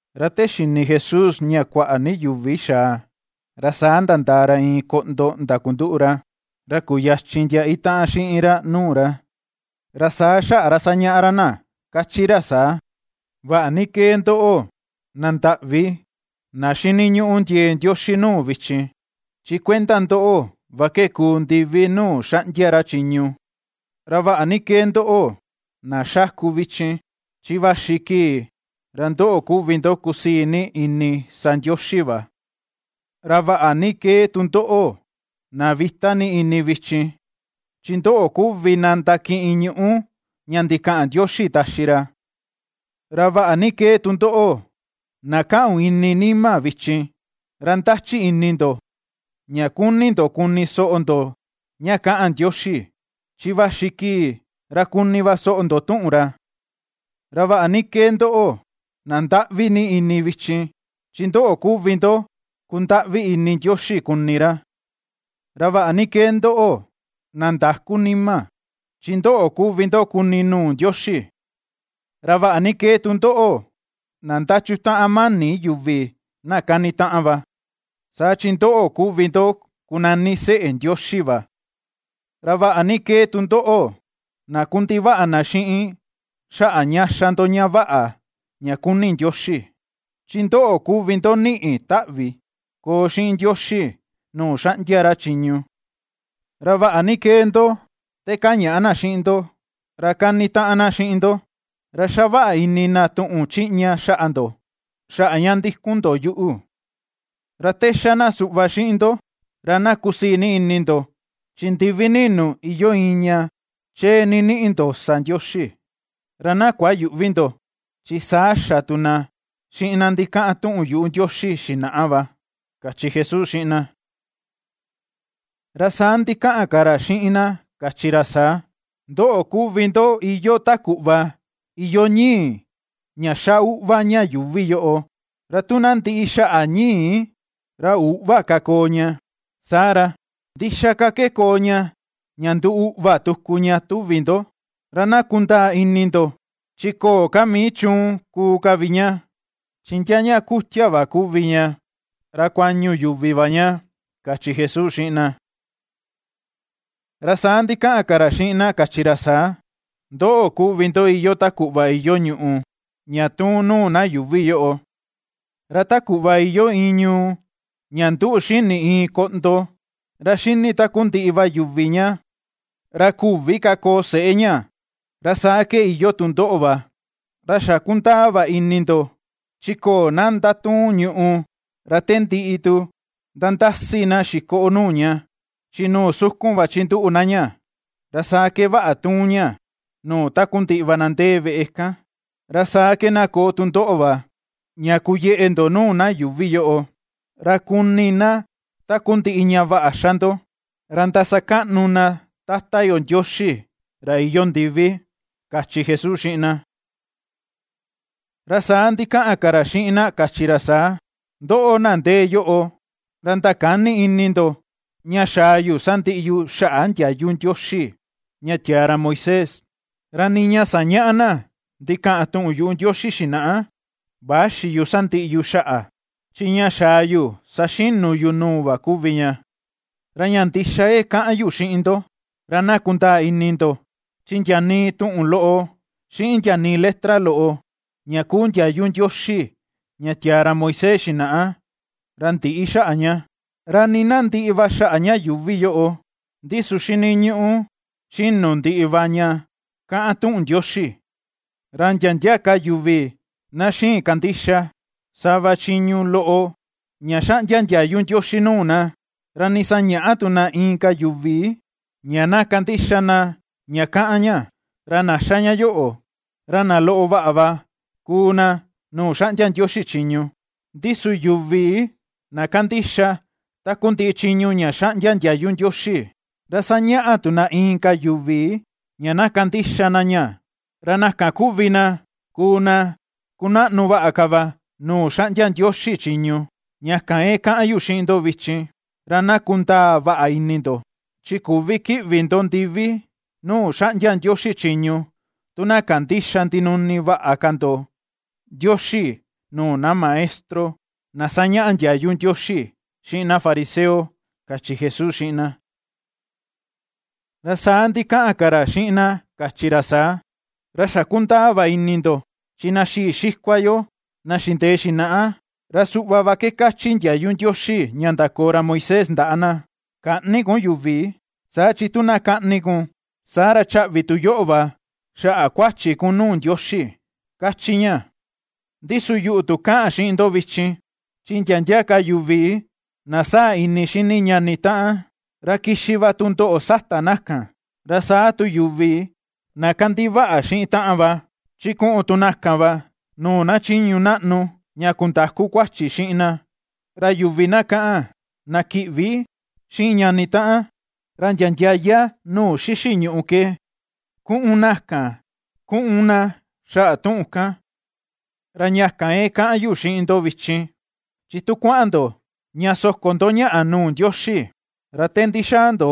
Ra te xini Jesús ña kuaꞌa ni yuvi xaa, ra saa nandaa ra iin koꞌndo ndakunduꞌu ra, ra kuyachin ndia itaꞌan xiꞌin ra nuu ra. Ra saa xaꞌa ra sañaꞌa ra na kachi ra saa: ―Vaꞌa ni kee ndoꞌo, na nda̱ꞌví, na xini ñuꞌu ndiee Ndioxi nuu vichin, chi kuenda ndoꞌo va ke kuu ndivi nuu xanꞌdia ra chiñu. Ra vaꞌa ni kee ndoꞌo, na xáku vichin, chi vaxi kii ra ndoꞌo kuvi ndo kusii ni ini sa Ndioxi va. Ra vaꞌa ni kee tu ndoꞌo, na vita ni ini vichin, chi ndoꞌo kuvi na ndakiꞌin ñuꞌú ña ndikaꞌan Ndioxi taxi ra. Ra vaꞌa ni kee tu ndoꞌo, na kaꞌun ini nima vichin, ra ndachi ini ndo ña kuni ndo kuni soꞌo ndo ña kaꞌan Ndioxi, chi vaxi kii ra kuni va soꞌo ndo tuꞌun ra. Ra vaꞌa ni kee ndoꞌo, na ndaꞌvi ni ini vichin, chi ndoꞌo kuvi ndo kundaꞌvi ni ini Ndioxi kuni ra. Ra vaꞌa ni kee ndoꞌo, na ndakú nima, chi ndoꞌo kuvi ndo kuni nuu Ndioxi. Ra vaꞌa ni kee tu ndoꞌo, na ndachutaꞌan mani yuvi na kanitaꞌan va, saa chi ndoꞌo kuvi ndo kunani seꞌe Ndioxi va. Ra vaꞌa ni kee tu ndoꞌo, na kundivaꞌa na xiꞌin xaꞌa ña xa ndo ña vaꞌa ña kuni Ndioxi, chi ndoꞌo kuvi ndo niꞌi taꞌvi koo xiꞌin Ndioxi nuu xaꞌndia ra chiñu. Ra vaꞌa ni kee ndo, te kañaꞌa na xiꞌin ndo, ra kani taꞌan na xiꞌin ndo, ra xavaꞌa ini na tuꞌun chiꞌña xaꞌa ndo, xaꞌa ña ndikun ndo yuꞌu. Ra te xá na suꞌva xiꞌin ndo, ra na kusii ni ini ndo, chi ndivi ninu iyoo iin ña chee ni niꞌi ndo sa Ndioxi; ra na kuayüꞌvi ndo, chi saa xa tu na xiꞌin na ndikaꞌan tuꞌun yuꞌu Ndioxi xinaꞌa va ―kachi Jesús xiꞌin na. Ra saa ndikaꞌan ka ra xiꞌin na kachi ra saa: ―Ndoꞌo kuvi ndo iyoo ta kuꞌva iyoo ñi̱i̱ ña xa uꞌva ña yuuvi yoꞌo, ra tu ná ndiꞌi xaꞌa ñi̱i̱, ra üꞌva ka koo ña. Saa ra, ¿ndixaa ka ke koo ña ña nduu uꞌva tuku ña, tuvi ndo? Ra na kundaa ini ndo, chi köo ka mii chuun kuu ka vi ña, chi ndia ña kutia va kuvi ña ra kuañu yuvi va ña ―kachi Jesús xiꞌin na. Ra saa ndikaꞌan ka ra xiꞌin na kachi ra saa: ―Ndoꞌo kuvi ndo iyoo ta kuꞌva iyoo ñùꞌù ña tuun nuu na yuuvi yoꞌo, ra ta kuꞌva iyoo iin ñuu ña nduꞌu xini iin koꞌndo, ra ^xini takundiꞌi va yuvi ña, ra küvi ka koo seꞌé ña, ra saa ke iyoo tu ndoꞌo va. Ra xa kundaa va ini ndo chi köo na ndatuun ñùꞌù, ra te ndiꞌi tu nandasi na xikoꞌo nuu ña, chi nuu sukun va chinduꞌu na ña, ra saa ke vaꞌa ^tuun ña nuu takundiꞌi va na ndee veꞌe kan. Ra saa ke na koo tu ndoꞌo va, ña kuyeꞌe ndo nuu na yuuvi yoꞌo, ra kuni na takundiꞌi ña vaꞌa ña xa ndo, ra ndasakaꞌnu na Tata yo Ndioxi ra iyoo ndivi ―kachi Jesús xiꞌin na. Ra saa ndikaꞌan ka ra xiꞌin na kachi ra saa: ―Ndoꞌo, na ndee yoꞌo, ra ndakäni ini ndo, ña xaa yu sandiꞌi yu xaꞌa ndiayu Ndioxi ña tiaa ra Moisés, ra nii ña ^sañaꞌa na ndikaꞌan tuꞌun yuꞌu Ndioxi xinaꞌa växi yu sandiꞌi yu xaꞌa; chi ña xaa yu saxinu yu nuu va kuvi ña. Ra ña ndixa ke kaꞌan yu xiꞌin ndo, ra na kundaa ini ndo: chi ndia nii tuꞌun loꞌo xiꞌin ndia nii letra loꞌo ña kuu ndiayu Ndioxi ña tiaa ra Moisés xinaꞌa, ra ndïꞌi xaꞌa ña, ra nii na ndiꞌi va xaꞌa ña yuuvi yoꞌo, ndi su xiniñuꞌu xinu ndiꞌi va ña kaꞌan tuꞌun Ndioxi. Ra ndia ndia ka yuvi na xïin kandixa sava chiñu loꞌo ña xaꞌndia ndiayu Ndioxi nuu na, ra nii sañäꞌa tu na inka yuvi ña na kandixa na ña kaꞌan ña, ra na xa ña yoꞌo ra na loꞌo vaꞌa va kuu na nuu xaꞌndia Ndioxi chiñu. Ndi su yuvi na kandixa takundiꞌi chiñu ña xaꞌndia ndiayu Ndioxi, ra sañaꞌa tu na inka yuvi ña na kandixa na ña, ra na kan kuvi na kuu na kunaꞌnu vaꞌa ka va nuu xaꞌndia Ndioxi chiñu. Ña kan ke kaꞌan yu xiꞌin ndoꞌo vichin, ra na kundaa vaꞌa ini ndo, chi küvi kiꞌvi ndo ndivi nuu xaꞌndia Ndioxi chiñu, tu na kandïxa ndinuni vaꞌa ka ndo Ndioxi nuu na maestro na sañaꞌa ndiayu Ndioxi xiꞌin na fariseo ―kachi Jesús xiꞌin na. Ra saa ndikaꞌan ka ra xiꞌin na kachi ra saa: ―Ra xa kundaa va ini ndo, chi na xii xikua yo na xindee xinaꞌa, ra suꞌva va ke kachi ndiayu Ndioxi ña ndakoo ra Moisés ndaꞌa na: “Käꞌni kun yuvi”, saa chi tu na kaꞌni kun, saa ra chaꞌvi tu yoꞌo va xaꞌa kuachi kun nuu Ndioxi, kachi ña. Ndi su yuꞌu tu kaꞌan xiꞌin ndo vichin, chi ndia ndia ka yuvi na sáa̱ ini xini ñani taꞌan, ra kixi va tundoꞌo sata na kan; ra saa tu yuvi na kandivaꞌa xiꞌin taꞌan va, chi ku̱ꞌu̱n tu na kan va nuu na chiñu naꞌnu ña kundaku kuachi xiꞌin na; ra yuvi na kaꞌan, “na kiꞌvi” xiꞌin ñani taꞌan, ra ndia ndiaya nuu xixi ñuꞌu ke ku̱ꞌu̱n na kan kuꞌun na xaꞌa tuꞌun kan. ’Ra ña kan ke kaꞌan yu xiꞌin ndo vichin, chi tu kuaꞌan ndo ña soko ndo ñaꞌa nuu Ndioxi ra te ndixaa ndo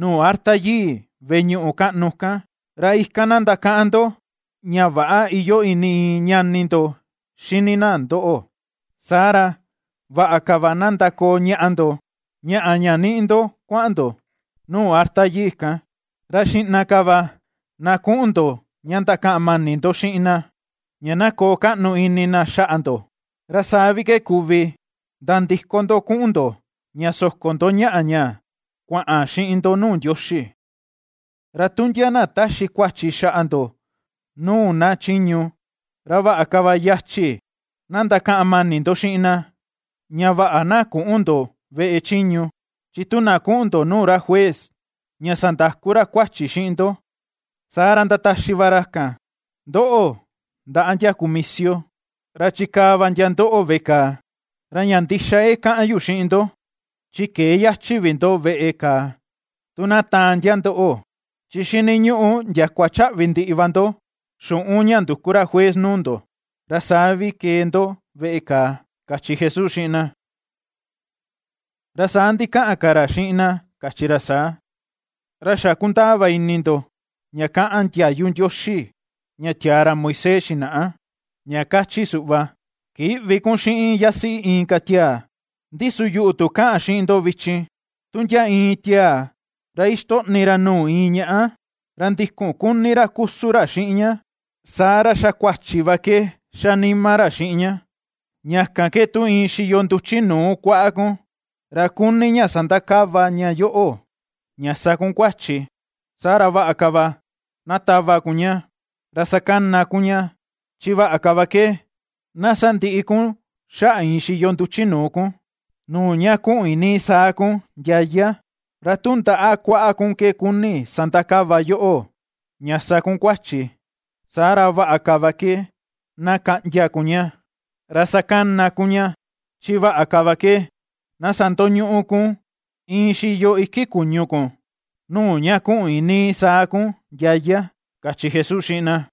nuu arta yii veꞌe ñuꞌu kaꞌnu kan, ra ikan na ndakaꞌan ndo ña väꞌa iyoo ini iin ñani ndo xini na ndoꞌo, saa ra, vaꞌa ka va na ndakoo ñaꞌa ndo, ñaꞌa ña niꞌi ndo kuaꞌan ndo nuu arta yii kan, ra xiꞌna ka va na kuꞌun ndo ña ndakaꞌan mani ndo xiꞌin na, ña na koo kaꞌnu ini na xaꞌa ndo, ra saa vi ke kuvi nandiko ndo kuꞌun ndo ña soko ndo ñaꞌa ña kuaꞌan xiꞌin ndo nuu Ndioxi. ’Ra tu ndia na taxi kuachi xaꞌa ndo nuu na chiñu, ra vaꞌa ka va yachi na ndakaꞌan mani ndo xiꞌin na, ña vaꞌa na küꞌun ndo veꞌe chiñu, chi tu na kuꞌun ndo nuu ra juez ña sandaku ra kuachi xiꞌin ndo, saa ra ndataxi va ra kan ndoꞌo ndaꞌa ndia kumisio, ra chikaa va ndia ndoꞌo veꞌe kàà. Ra ña ndixa ke kaꞌan yu xiꞌin ndo, chi këe yachi vi ndo veꞌe kàà tu na taan ndia ndoꞌo, chi xiniñuꞌu ndiakua chaꞌvi ndiꞌi va ndo xuꞌun ña nduku ra juez nuu ndo, ra saa vi kee ndo veꞌe kàà ―kachi Jesús xiꞌin na. Ra saa ndikaꞌan ka ra xiꞌin na kachi ra saa: ―Ra xa kundaa va ini ndo ña kaꞌan ndiayu Ndioxi ña tiaa ra Moisés xinaꞌa ña kachi suꞌva: “Kïꞌvi kun xiꞌin yasiꞌi inka tiaa.” Ndi su yuꞌu tu kaꞌan xiꞌin ndo vichin: tu ndia iin tiaa ra ixtoꞌni ra nuu iin ñaꞌa, ra ndikun kuni ra kusun ra xiꞌin ña, saa ra xa kuachi va ke xa nima ra xiꞌin ña. ’Ña kan ke tu iin xiyo nduchi nuu kuaꞌa kun, ra kuni ña sandakava ña yoꞌo, ña sa kun kuachi, saa ra vaꞌa ka va na tava kun ña, ra sakana kun ña; chi vaꞌa ka va ke na sandiꞌi kun xaꞌa iin xiyo nduchi nuu kun, nuu ña kuꞌun iinii saa kun ndiaya. Ra tu ndaꞌa kuaꞌa kun ke kuni sandakava yoꞌo ña sa kun kuachi, saa ra vaꞌa ka va ke na kaꞌndia kun ña, ra sakana kun ña, chi vaꞌa ka va ke na sandoñuꞌu kun iin xiyo iki kuñu kun, nuu ña kuꞌun iinii saa kun ndiaya ―kachi Jesús xiꞌin na.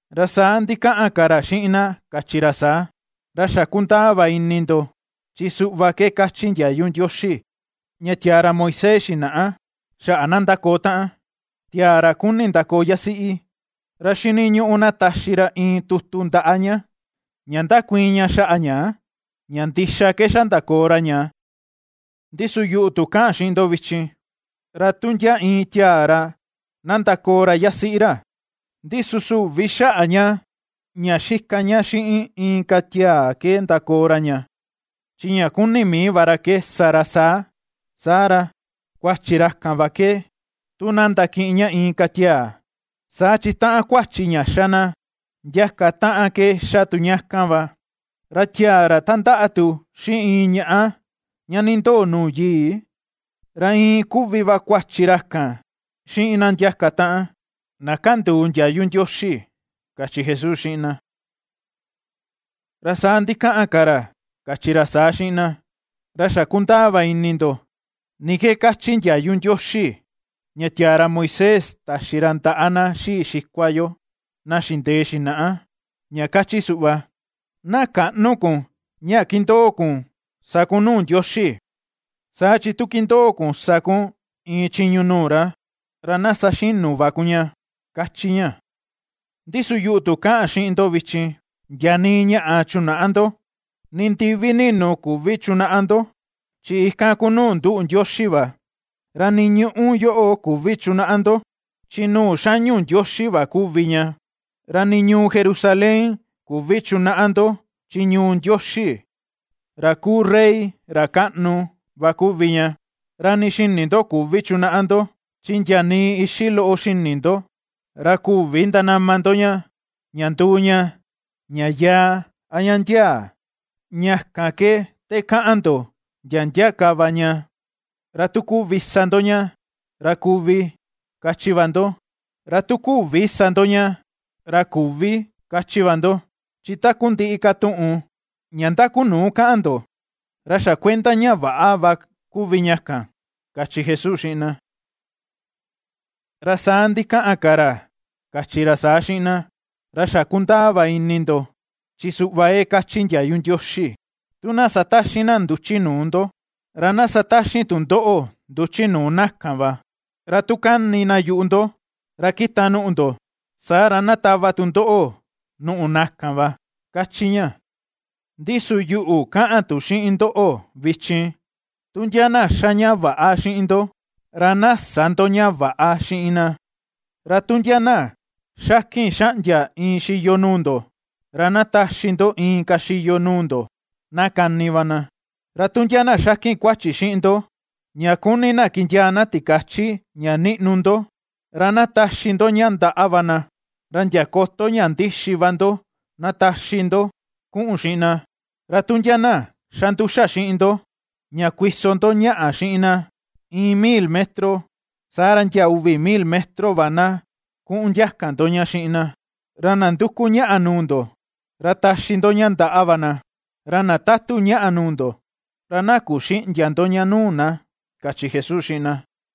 Ra saa ndikaꞌan ka ra xiꞌin na kachi ra saa: ―Ra xa kundaa va ini ndo chi suꞌva ke kachi ndiayu Ndioxi ña tiaa ra Moisés xinaꞌa xaꞌa na ndakoo taꞌan: Tiaa ra kuni ndakoo yasiꞌi, ra xiniñuꞌu na taxi ra iin tutu ndaꞌa ña, ña ndakuiin ña xaꞌa ña, ña ndixa ke xa ndakoo ra ña. Ndi su yuꞌu tu kaꞌan xiꞌin ndo vichin: ra tu ndia iin tiaa ra na ndakoo ra yasiꞌi ra, ra ndi su süvi xaꞌa ña ña xika ña xiꞌin inka tiaa ke ndakoo ra ña, chi ña kuni mii va ra ke sa ra saa, saa ra, kuachi ra kan va ke tu na ndakiꞌin ña inka tiaa, saa chi taꞌan kuachi ña xa na ndiaka taꞌan ke xa tu ña kan va. Ra tiaa ra tandaꞌa tu xiꞌin iin ñaꞌa ña nindoo nuu yii, ra iin kuvi va kuachi ra kan xiꞌin na ndiaka taꞌan, na kanduu ndiayu Ndioxi ―kachi Jesús xiꞌin na. Ra saa ndikaꞌan ka ra kachi ra saa xiꞌin na: ―Ra xa kundaa va ini ndo ni ke kachi ndiayu Ndioxi ña tiaa ra Moisés taxi ra ndaꞌa na xii xikua yo na xindee xinaꞌa, ña kachi suꞌva: “Na käꞌnu kun ña kindoo kun sa kun nuu Ndioxi, saa chi tu kindoo kun sa kun iin chiñu nuu ra, ra na saxinu va kun ña”, kachi ña. Ndi su yuꞌu tu kaꞌan xiꞌin ndo vichin, ndia nii ñaꞌa chunäꞌa ndo, ni ndivi ninu küvi chunaꞌa ndo, chi ikan kuu nuu nduꞌu Ndioxi va. Ra nii ñuꞌu yoꞌo küvi chunaꞌa ndo, chi nuu xañu Ndioxi va kuvi ña; ra nii ñuu Jerusalén küvi chunaꞌa ndo chi ñuu Ndioxi, ra kuu rey ra kaꞌnu, va kuvi ña. Ra nii xini tu ndo küvi chunaꞌa ndo, chi ndia nii ixi loꞌo xini ndo ra küvi ndanama ndo ña, ña nduu ña, ña yaa a ña ndiaa. Ña kan ke te kaꞌan ndo ndia ndia ka va ña, ra tu kuvi sa ndo ña, ra “kuvi”, kachi va ndo, ra tu küvi sa ndo ña, ra “küvi”, kachi va ndo. Chi takundiꞌi ka tuꞌun ña ndakunuu kaꞌan ndo, ra xa kuenda ña väꞌa va kuvi ña kan ―kachi Jesús xiꞌin na. Ra saa ndikaꞌan ka ra kachi ra saa xiꞌin na: ―Ra xa kundaa va ini ndo chi suꞌva ke kachi ndiayu Ndioxi: “Tu na sataxin na nduchi nuu ndo, ra na sataxin tu ndoꞌo nduchi nuu na kan va; ra tu kani na yuꞌu ndo ra kita nùꞌù ndo, saa ra na tava tu ndoꞌo nùꞌù na kan va”, kachi ña. Ndi su yuꞌu kaꞌan tu xiꞌin ndoꞌo vichin: Tu ndia na ^xa ña väꞌa xiꞌin ndo, ra na sä ndoꞌo ña väꞌa xiꞌin na, ra tu ndia na xakin xaꞌndia iin xiyo nuu ndo, ra na taxi ndo inka xiyo nuu ndo na kani va na. Ra tu ndia na xakin kuachi xiꞌin ndo ña kuni na kindiaa na tikachi ña niꞌnu ndo, ra na taxi ndo ña ndaꞌa va na, ra ndia koto ña ndixi va ndo na taxi ndo kuꞌun xiꞌin na. Ra tu ndia na xa nduxa xiꞌin ndo ña kuiso ndo ñaꞌa xiꞌin na, iin mil metro, saa ra ndia uvi mil metro va na kuꞌun ndiaka ndo ña xiꞌin na. Ra na nduku ñaꞌa nuu ndo, ra taxi ndo ña ndaꞌa va na, ra na tatu ñaꞌa nuu ndo, ra na kuxïꞌndia ndo ña nuu na ―kachi Jesús xiꞌin na.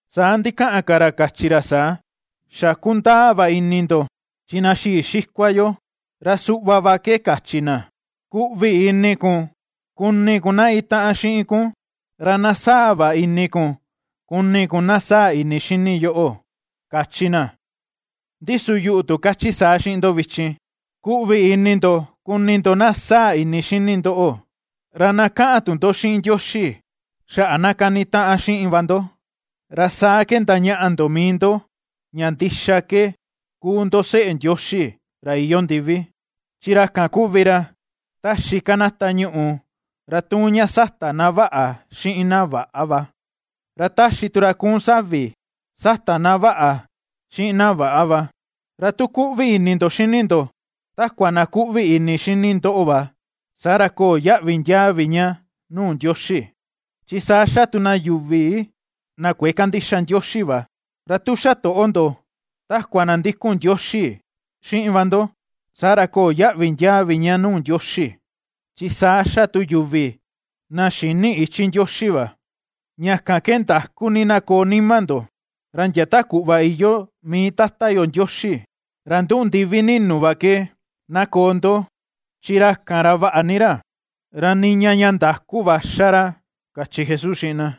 Saa ndikaꞌan ka ra kachi ra saa: ―Xa kundaa va ini ndo chi na xii xikua yo ra suꞌva va ke kachi na: “Kuꞌvi ini kun kuni kun na itaꞌan xiꞌin kun, ra na sáa̱̱ va ini kun kuni kun na sáa̱̱ ini xini yoꞌo”, kachi na. Ndi su yuꞌu tu kachi saa xiꞌin ndo vichin: Kuꞌvi ini ndo kuni ndo na sáa̱̱ ini xini ndoꞌo, ra na kaꞌan tu ndo xiꞌin Ndioxi xaꞌa na kanitaꞌan xiꞌin va ndo. Ra saa ke ndañaꞌa ndo mii ndo ña ndixa ke kuu ndo seꞌe Ndioxi ra iyoo ndivi, chi ra kan kuvi ra ^taxi kanata ñuꞌu ra tuun ña sata na vaꞌa xiꞌin na väꞌa va, ra ^taxi tu ra kuun savi sata na vaꞌa xiꞌin na väꞌa va. Ra tu kuꞌvi ini ndo xini ndo takua na kuꞌvi ini xini ndoꞌo va, saa ra köo yaꞌvi ndiaa vi ña nuu Ndioxi, chi saa xa tu na yuvi na kuëe kandixa Ndioxi va. Ra tu xatoꞌo ndo takua na ndikun Ndioxi xiꞌin va ndo, saa ra köo yaꞌvi ndiaa vi ña nuu Ndioxi, chi saa xa tu yuvi na xïni ichi Ndioxi va. Ña kan ke ndakú ni na koo nima ndo, ra ndia ta kuꞌva iyoo mii Tata yo Ndioxi ra nduꞌu ndiví ninu va ke, na koo ndo; chi ra kan ra vaꞌa ni ra; ra niña ña ndakú va ^xa ra ―kachi Jesús xiꞌin na.